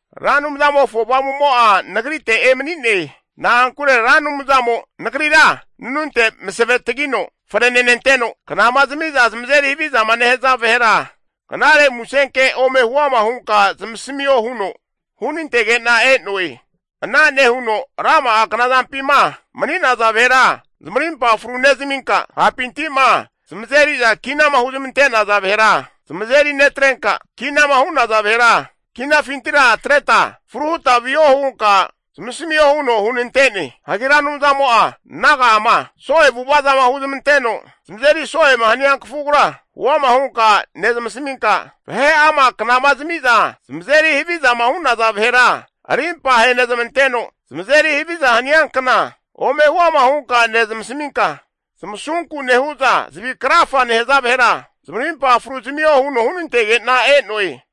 Ra Anumzamofo Avamumo'a nagrite emani'ne. Na'ankure Ra Anumzamo nagrira nanunte masave tagino frenenanteno, knama zamiza zamazeri havizama nehaza vahera knare musenke ome huama hunka zamasamio huno hunantege'na e'noe. Ana nehuno rama'a knazampima mani'naza vahera zamarimpa fru nezaminka, hapinti'ma zamazeri'za kinama huzmante'naza vahera zamazeri netrenka, kinama hu'naza vahera kinafintira atreta fruhuta viho hunka zamasamio huno hunante'ne. Hagi Ra Anumzamo'a naga'ama so'e avu'avazama huzmanteno zamazeri so'ema hania kafugura huama hunka nezmasaminka, vahe'ama knama zamiza zamazeri havizama hu'naza vahera arimpa ahenezmanteno zamazeri haviza haniankna ome huama hunka nezamasaminka, zamasunku nehu'za zavi krafa nehaza vahera zamarimpa fru zamio huno hunantege'na e'noe.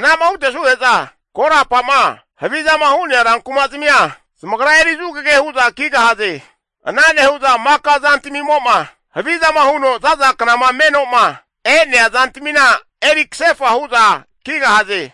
Anama hutesuge'za korapa'ma havizama hu'nea rankumazmia zamagra eri zugage hu'za kigahaze. Ana nehu'za maka zantamimo'ma havizama huno za'za knama meno'ma e'nea zantamina eri kasefa hu'za kigahaze.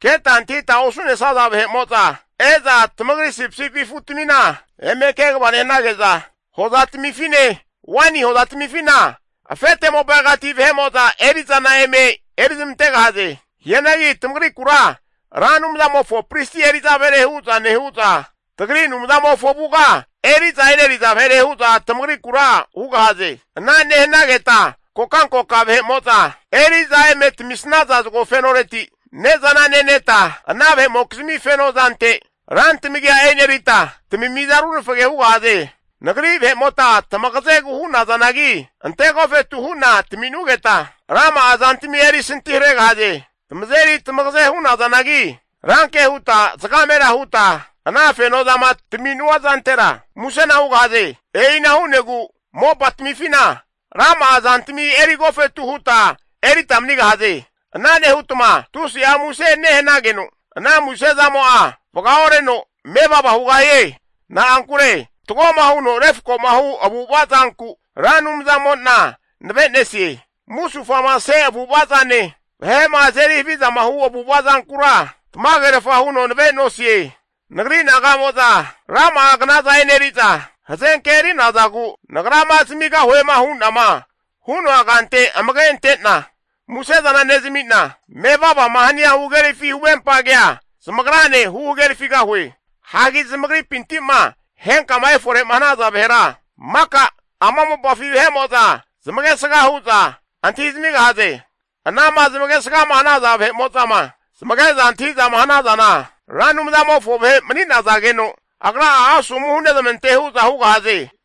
Keta antahita osu'nesaza vahe'mo'za e'za tamagri sipisipi afutamina eme kegava nehanage'za, hozatamifine waini hozatamifina afete moparegati vahe'mo'za eri'zana eme eri ramantegahaze. Hianagi tamagrikura Ra Anumzamofo pristi eri'za vahere hu'za nehu'za, tagri Anumzamofo avuga eri'za eneriza vahere hu'za tamagrikura hugahaze. Ana nehanageta kokankoka vahe'mo'za eri'za eme tamamisnaza zagofenoreti ne'zana neneta, ana vahe'mokizmi feno zante rantamagia enerita tamimiza runafage hugahaze. Nagri vahe'mota tamagazegu hu'nazanagi ante agofetu hu'na tami'nugeta rama'a zantami eri santiharegahaze. Tamazeri tamagaze hu'nazanagi, ranke huta zagamera huta ana fenozama tami'nua zantera musena hugahaze. E'ina hu'negu mopatamifina rama'a zantami eri agofetu huta erita manigahaze. Ana nehutma tusi'a muse nehanageno ana muse zamo'a vaga oreno mevava hugahie. Na'ankure fatgoma huno refkoma hu avu'ava zanku Ra Anumzamo'na nave'nesie. Musufamase avu'avazane, vahe'ma azeri havizama hu avu'ava zankura tamagerafa huno nave'nosie. Nagri naga'mo'za rama'a knaza eneri'za hazenke eri'nazagu, nagrama zamigahuema hu'nama hu'noa kante amage ante'na musezana nezami'na, mevavama hania huhagerafi huvempa kea zamagrane huhagerafigahue. Hagi zamagripinti'ma henkama efore'ma hanaza vahera, maka ama mopafi vahe'mo'za zamagesga hu'za antahizamigahaze. Anama zamagesgama hanaza vahe'mo'zama zamage'za antahi'zama hanazana, Ra Anumzamofo vahe mani'nazageno agra'a asomu hunezmante hu'za hugahaze.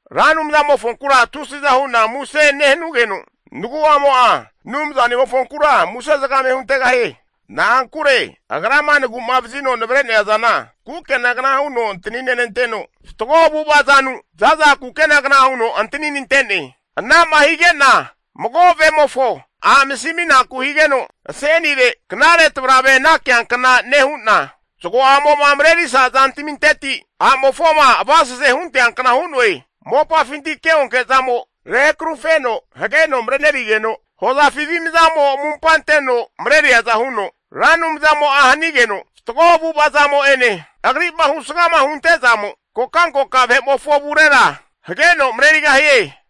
Ra Anumzamofonkura tusiza hu'na muse nehanugeno, nagu'amo'a Anumzanimofonkura muse zagame hunteghie. Na'ankure Agrama nagu'mavazino navre'nea zana kukenagna huno antaninenanteno, fatgo avu'ava zanu, zaza kukenagna huno antaninante'ne. Ana'ma hige'na mago vemofo a'masiminaku higeno asenire knare tavrave anakiankna nehu'na, zagoamo'ma marerisa zantaminteti a'mofoma avasese hunteankna hu'noe. Mopafinti keonke zamo rehakarufeno hageno marenerigeno, hozafi avimzamo amumpa anteno mareriaza huno, Ra Anumzamo'a hanigeno, fatgo avu'avazamo'ene Agri'ma husgama huntezamo kokankoka vahe'mofo avurera hageno marerigahie.